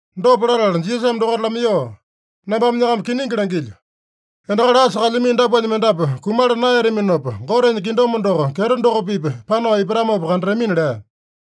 Dopa latala Jisasame dokaita lamaiyoo, “Nambame nyakama kiningi langilyo: Endakali asa kalyamino dapuanya mendapu kumala naeyataminopa, Gotenya kingdom doko kyeto doko-pipa panao ipatamopa kandatamina” lea.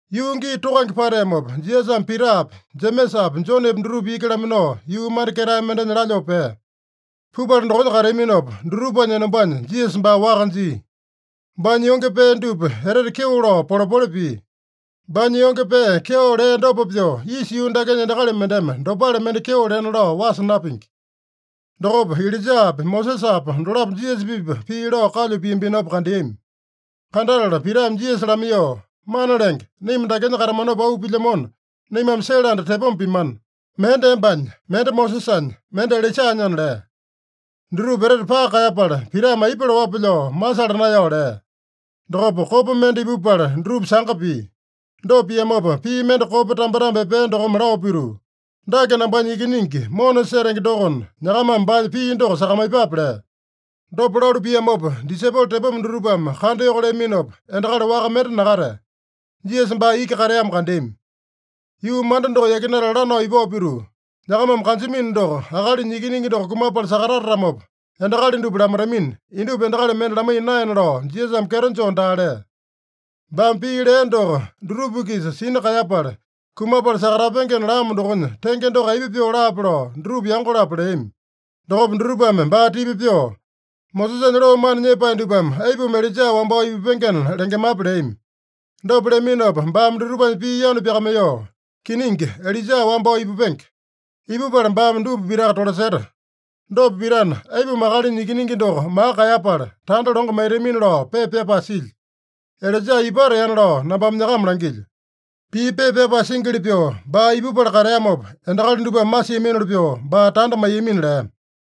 Yuu gii tokange pateamopa, Jisasame Pitapi, Jemesapi, Jonepi dutupa iki laminao, yuu manda ketae mendenya lalyoo pea. Pupala dokonya kateaminopa, dutupanya enombanya Jisasa baa waka jia. Baanya yonge pee dupa etete kyeo lao polepole pia. Baanya yonge pee kyeo lea dopa pyoo, isa yuu dakenya endakali mendeme dopale mende kyeo lena lao wasa napingi. Dokopa Ilaijapa, Mosesapa dolapo Jisasa-pipa pii lao kalyu piambinopa kandeami. Kandatala Pitame Jisasa lamaiyoo, “Mana Lenge, naima dakenya katamanopa auu pilyamona, naimame sele anda tepoma pimana. Mende embanya, mende Mosesanya, mende Ilaijanyana” lea. (Dutupa etete paka kaeyapala, Pitame aipa laowape lao masala naeyao lea.) Dokopa kopa mende ipupala dutupa sanga pia. Dopa piamopa pii mende kopa tambetambe epea dokome lao pituu, “Dake nambanya Ikiningi mona setenge dokona, nyakamame baanya pii doko sakamaiyepape” lea. Dopa lalu piamopa disaipolo tepoma dutupame kandayoko leaminopa, endakali waka mende nakatea. Jisasa baa iki kateamo kandeami. Yuu manda doko yakinatala lanao ipao pituu, nyakamame kanjamino doko, Akalinya Ikiningi doko kumapala sakatatatamopa, endakali dupa lamaitamina, indupa endakali mende lamaiya naena lao, Jisasame kyeto joo daa lea. Baame pii lea doko dutupa-kisa sina kaeyapala, kumapala sakatapengena lamo dokonya tenge doko aipa pyoo laape lao dutupa yango-lapo leami. Dokopa dutupame baa tipa pyoo, “Mosesanya loo mana nyepae dupame aipuma Ilaija wambao ipupengena lengemape?” leami. Dopa leaminopa baame dutupanya pii yanu pyakamaiyoo, “Kiningi, Ilaija wambao ipupenge. Ipupala baame dupa pitaka tolaseta. Dopa pitana, aipuma Akalinya Ikiningi doko maka kaeyapala, tanda longo maitamina lao pepa pyapae silya? Ilaija ipateana lao nambame nyakama langilyo. Pii pepa pyapae singili pyoo, baa ipupala kateamopa, endakali dupame masiaminoli pyoo baa tanda maiyamina” lea.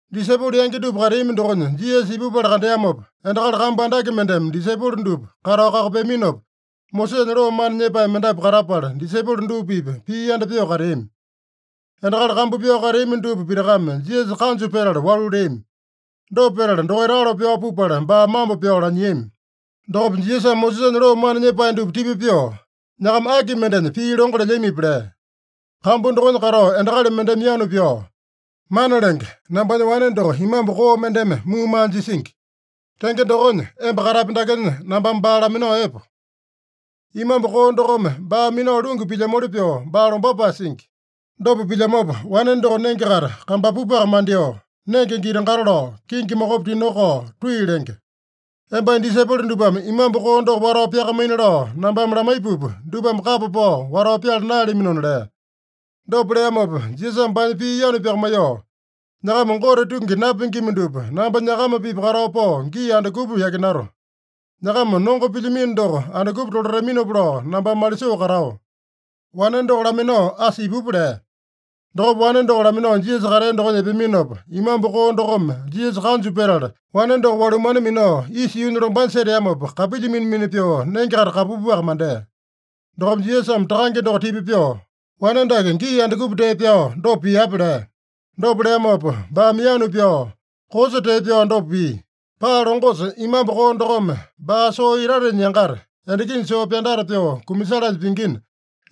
Disaipolo yangi dupa kateami dokonya Jisasa ipupala kandeamopa, endakali kambu andake mendeme disaipolo dupa katao kakopeaminopa, Mosesanya loo mana nyepae mendapu katapala, disaipolo dupa-pipa pii yanda pyoo kateami. Endakali kambu pyao kateami dupa pitakame Jisasa kanju petala walu leami. Dopa petala dokaita alo pyao pupala baa mambo pyao lanyiami. Dokopa Jisasame Mosesanya loo mana nyepae dupa tipa pyoo, “Nyakama aki mendenya pii longo lelyamipi?” lea. Kambu dokonya katao endakali mendeme yanu pyao, “Mana Lenge, nambanya wane doko imambu koo mendeme muumaa jisingi. Tenge dokonya, emba katapi dakenya nambame baa laminao epo. Imambu koo dokome baa minao lungu pilyamoli pyoo baa lombapae singi. Dopa pilyamopa, wane doko nenge-kaita kambapupaka mandyoo, nenge giti-gato lao, kingi mokopi tinokao tui lenge. Embanya disaipolo dupame imambu koo doko watao pyakamaina lao nambame lamaipupa, dupame kapa pao watao pyala naeyalaminona” lea. Dopa leamopa Jisasame baanya pii yanu pyakamaiyoo, “Nyakama Gote tungi napingima dupa, namba nyakama-pipa katao pao gii andukupa yakinato? Nyakama nongo pilyamino doko andukupa tolataminopa lao nambame malisoo katao? Wane doko laminao asa ipupa” lea. Dokopa wane doko laminao Jisasa katea dokonya epeaminopa, imambu koo dokome Jisasa kanju petala, wane doko walumane minao isa yuunya lombanya seteamopa, kapilya mina-mina pyoo nenge-kaita kambapupaka mandea. Dokopa Jisasame takange doko tipa pyoo, “Wane dake gii andukupa tee pyao dopa piape?” lea. Dopa leamopa baame yanu pyao, “Koosa tee pyao dopa pia. Paa longosa imambu koo dokome baa soo itatenya yangata, endakinya soo pyandata pyoo kumasalanya pingina,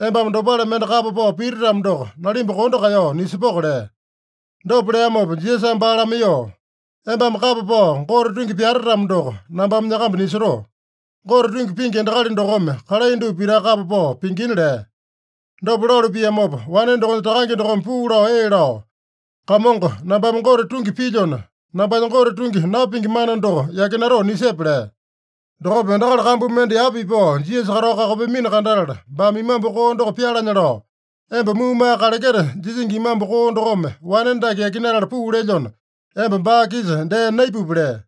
embame dopale mende kapa pao piti-tamo doko, nalimba kondo kaeyao nisepoko” lea. Dopa leamopa Jisasame baa lamaiyoo, “Embame kapa pao Gote tungi pyate-tamo doko, nambame nyakamba nisotoo. Gote tungi pingi endakali dokome kalai dupa pitaka kapa pao pingina” lea. Dopa lalu piamopa, wane dokonya takange dokome puu lao ee lao, “Kamongo, nambame Gote tungi pilyona, nambanya Gote tungi napingi mana doko yakinatoo nisepe” lea. Dokopa endakali kambu mende yapa ipao Jisasa katao kakopeamino kandatala, baame imambu koo doko pyalanya lao, “Emba muumaa kaleketa jisingi imambu koo dokome wane dake yakinatala puu lelyona, emba baa-kisa dee naipupi” lea.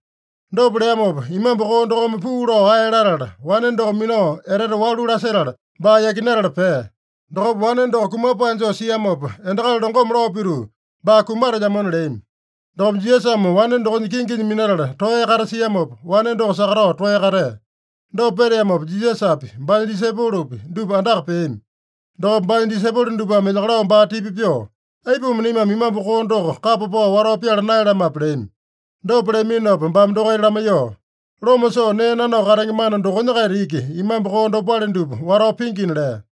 Dopa leamopa imambu koo dokome puu lao ae latala, wane doko minao etete walu lasetala, baa yakinatala pea. Dokopa wane doko kumapae joo siamopa, endakali longome lao pituu, “Baa kumatelyamona” leami. Dokopa Jisasame wane dokonya kinginya minatala toeya katasiamopa, wane doko sakatao toeya katea. Dopa peteamopa, Jisasapi, baanya disaipolopi, dupa andaka peami. Dokopa baanya disaipolo dupame elyakalao baa tipa pyoo, “Aipuma naimame imambu koo doko kapa pao watao pyala naeyalamape?” leami. Dopa leaminopa baame dokaita lamaiyoo, “Loma soo nee nanao katenge mana dokonya-kaita iki imambu koo dopale dupa watao pingina” lea.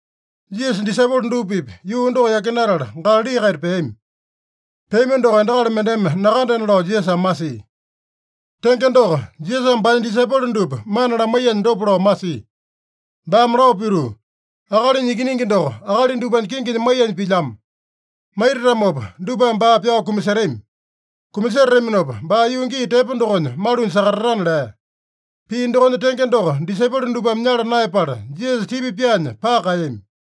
Jisasa disaipolo dupa-pipa yuu doko yakinatala Galali-kaita peami. Peami doko endakali mendeme nakandena lao Jisasame masia. Tenge doko, Jisasame baanya disaipolo dupa mana lamaiyanya dopa lao masia. Baame lao pituu, “Akalinya Ikiningi doko akali dupanya kinginya maiyanya pilyamo. Maitatamopa dupame baa pyao kumasetami. Kumasetataminopa baa yuu gii tepo dokonya malunya sakatatana” lea. Pii dokonya tenge doko disaipolo dupame nyala naeyapala, Jisasa tipa pyaanya paka kaeyami.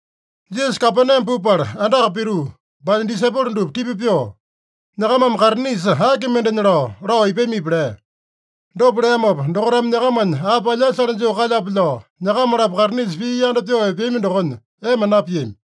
Jisasa Kapename pupala andaka pituu, baanya disaipolo dupa tipa pyoo, “Nyakamame kaitinisa aki mendenya lao, lao ipamipi?” lea. Dopa leamopa, dokaitame nyakamanya api alyasale joo kalyape lao, nyakama-lapo kaitinisa pii yanda pyoo epeami dokonya ema napiami.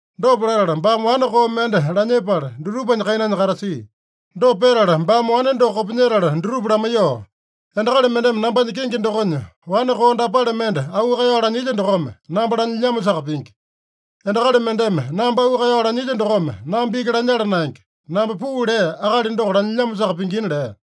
Dopa latala baame wane koo mende lanyepala, dutupanya kainanya katasia. Dopa petala baame wane doko kopinyetala dutupa lamaiyoo, “Endakali mendeme nambanya kenge dokonya wane koo dapale mende auu kaeyao lanyilya dokome, namba lanyilyamosaka pingi. Endakali mendeme namba auu kaeyao lanyilya dokome namba iki lanyala naenge. Namba puu lea Akali doko lanyilyamosaka pingina” lea.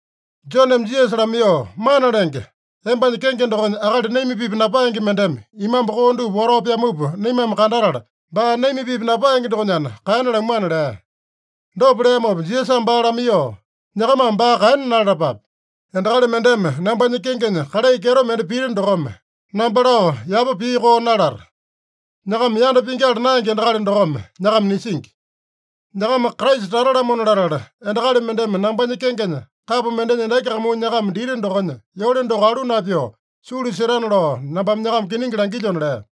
Joneme Jisasa lamaiyoo, “Mana Lenge, embanya kenge dokonya akali naima-pipa napaenge mendeme imambu koo dupa watao pyamupa naimame kandatala, baa naima-pipa napaenge dokonyana kaena lamuana” lea. Dopa leamopa Jisasame baa lamaiyoo, “Nyakamame baa kaena nalalapape. Endakali mendeme nambanya kengenya kalai kyeto mende pita dokome, namba lao yapa pii koo nalata. Nyakama yanda pingyala naenge endakali dokome nyakama nisingi. Nyakama Kraisa tata-lamona latala, endakali mendeme nambanya kengenya kapo mendenya endaki kamuu nyakama dita dokonya yole doko alu napyoo, sulu setana lao nambame nyakama kiningi langilyona” lea.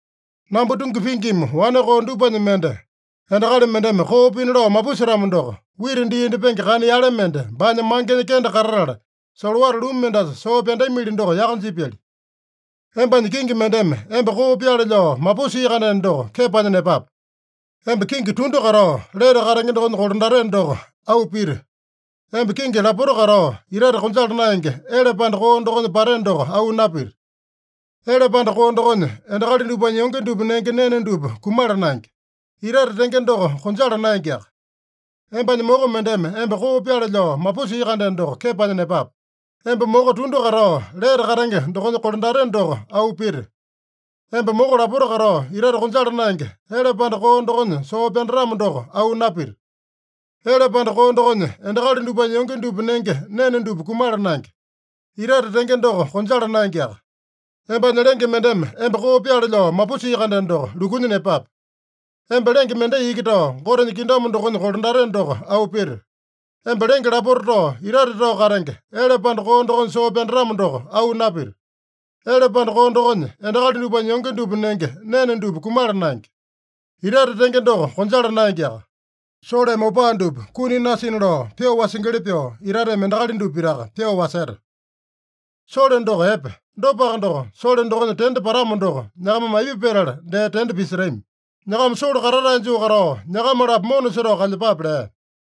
“Namba tungi pingima wane koo dupanya mende endakali mendeme koo pina lao mapusetamo doko, wita dii indyepenge kana yale mende baanya mangenya kende katatala, solowata lumu mendasa soo pyandamili doko yaka jipyali. Embanya kingi mendeme emba koo pyaale lao mapusia-kandeno doko, kepanya nepape. Emba kingi tundu katao, lete katenge dokonya kolandateno doko auu pita. Emba kingi lapota katao, itate konjala naenge, ele panda koo dokonya pateno doko auu napita. Ele panda koo dokonya, endakali dupanya yonge dupa nenge nene dupa kumala naenge. Itate tenge doko konjala naengeaka. Embanya moko mendeme emba koo pyaale lao mapusia-kandeno doko, kepanya nepape. Emba moko tundu katao, lete katenge dokonya kolandateno doko auu pita. Emba moko lapota katao, itate konjala naenge, ele panda koo dokonya soo pyandatamo doko auu napita. Ele panda koo dokonya, endakali dupanya yonge dupa nenge nene dupa kumala naenge. Itate tenge doko konjala naengeaka. Embanya lenge mendeme emba koo pyaale lao mapusia-kandeno doko, lukunya nepape. Emba lenge mendai iki tao, Gotenya kingdom dokonya kolandateno doko auu pita. Emba lenge lapota tao, itate tao katenge, ele panda koo dokonya soo pyandatamo doko auu napita. Ele panda koo dokonya, endakali dupanya yonge dupa nenge nene dupa kumala naenge. Itate tenge doko konjala naengeaka. Soleme opaa dupa kuni nasina lao pyoo wasingili pyoo, itateme endakali dupa pitaka pyoo waseta. Sole doko epe. Dopaka doko, sole dokonya tende patamo doko, nyakamame aipa petala dee tende pisetami? Nyakama sole katatae joo katao, nyakama-lapo mona setao kalyepape” lea.